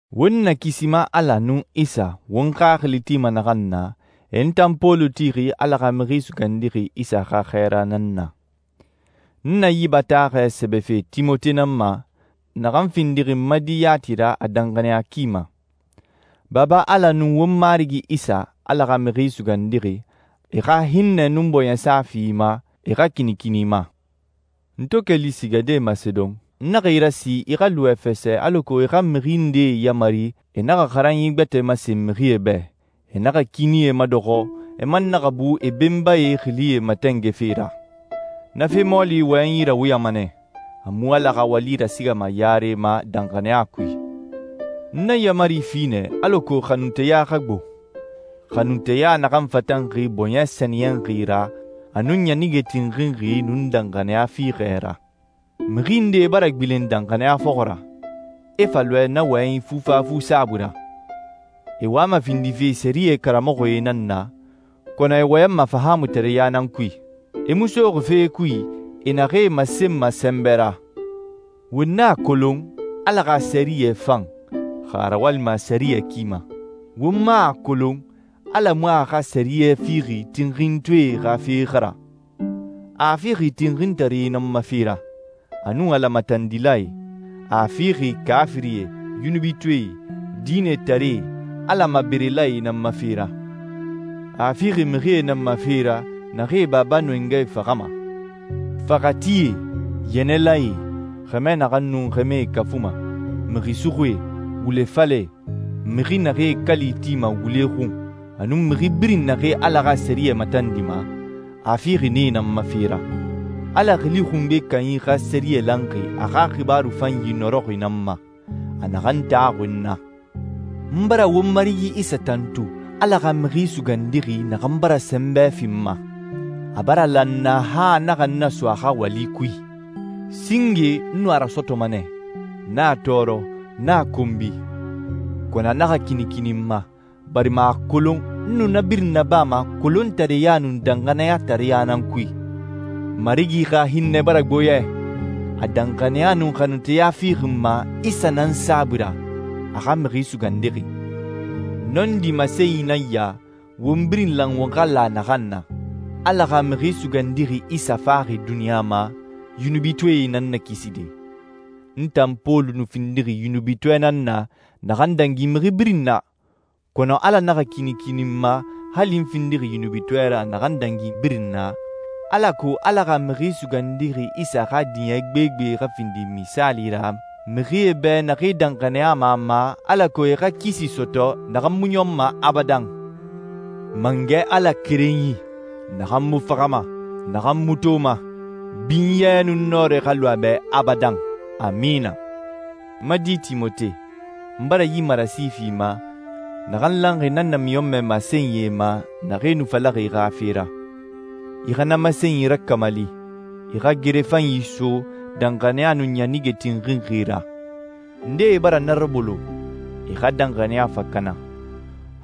Won Nakisima Ala nun Isa, won xaxili tima naxan na, e n tan Pɔlu tixi Ala xa Mixi Sugandixi Isa xa xɛɛra nan na. N na yi bataaxɛ sɛbɛfe Timote nan ma, naxan findixi n ma di yati ra a danxaniya ki ma. Baba Ala nun won Marigi Isa, Ala xa Mixi Sugandixi, e xa hinnɛ nun bɔɲɛsa fi i ma, e xa kinikini i ma. N to keli sigade Masedon, n naxa i rasi i xa lu Efɛsɛ alako i xa mixi ndee yamari e naxa xaranyi gbɛtɛe masen mixie bɛ, e naxa kiinie madɔxɔ, e man naxa bu e benbae xilie matɛngɛfe ra. Na fe mɔɔli wɔyɛnyi rawuyama nɛ, a mu Ala xa wali rasigama yare ma danxaniya kui. N na yaamari fi nɛ alako xanunteya xa gbo, xanunteya naxan fatanxi bɔɲɛ sɛniyɛnxi ra, a nun ɲanige tinxinxi, nun danxaniya fiixɛ ra. Mixi ndee bara gbilen danxaniya fɔxɔ ra, e fa lɔɛ, na wɔyɛnyi fufafu saabui ra. E wama findife sɛriyɛ karamɔxɔe nan na, kɔnɔ e wɔyɛnma fahaamutareɲa nan kui. E mu soxi fee kui e naxee masenma sɛnbɛ ra. Won a kolon Ala xa sɛriyɛ fan, xa a rawalima a sɛriyɛ ki ma. Won man a kolon Ala mu a xa sɛriyɛ fixi tinxintɔɛe xa fe xa ra. A a fixi tinxintaree nan ma fe ra, a nun Ala matandilae. A a fixi kaafirie, yunubitɔɛe, diinɛtaree, Ala maberelae nan ma fe ra. A a fixi mixie nan ma fe ra naxee e baba nun e ngae faxama. Faxatie, yɛnɛlae, xɛmɛ naxee nun xɛmɛe kafuma, mixi suxuie, wule falɛe, mixi naxee kali tima wule xun, a nun mixi birin naxee Ala xa sɛriyɛ matandima, a a fixi nee nan ma fe ra. Ala Xili Xungbe Kanyi xa sɛriyɛ lanxi a xa xibaaru fanyi nɔrɔxi nan ma, a naxan taxuxi n na. N bara won Marigi Isa tantu, Ala xa Mixi Sugandixi naxan bara sɛnbɛ fi n ma, a bara la n na han a naxa n naso a xa wali kui. Singe n nu a rasɔtɔma nɛ, n a tɔɔrɔ, n a konbi. Kɔnɔ a naxa kinikini n ma, barima a a kolon n nu na birin nabama kolontareya nun danxaniyatareɲa nan kui. Marigi xa hinnɛ bara gbo yɛ. A danxaniya nun xanunteya fixi n ma Isa nan saabui ra, a xa Mixi Sugandixi. Nɔndi masenyi nan ya won birin lan won xa la naxan na: Ala xa Mixi Sugandixi Isa faxi duniɲa ma yunubitɔɛe nan nakiside. N tan Pɔlu nu findixi yunubitɔɛ nan na naxan dangi mixi birin na, kɔnɔ Ala naxa kinikini n ma hali n findixi yunubitɔɛ ra naxan dangi birin na, alako Ala xa Mixi Sugandixi Isa xa diɲɛ gbegbe xa findi misaali ra mixie bɛ naxee danxaniyama a ma alako e xa kisi sɔtɔ naxan mu ɲɔnma abadan. Mangɛ Ala Kerenyi, naxan mu faxama, naxan mu toma, binyɛ nun nɔrɛ xa lu a bɛ abadan. Amina. N ma di Timote, n bara yi marasi fi i ma, naxan lanxi na namiɲɔnmɛ masenyie ma naxee nu falaxi i xa fe ra. I xa na masenyi rakamali, i xa gere fanyi so danxaniya nun ɲanige tinxinxi ra. Ndee bara na rabolo, e xa danxaniya fa kana.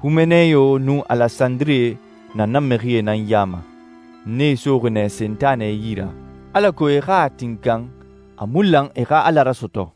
Humeneyo nun Alesandire na na mixie nan ya ma. N nee soxi nɛ Sentanɛ yi ra, alako e xa a tinkan a mu lan e xa Ala rasɔtɔ.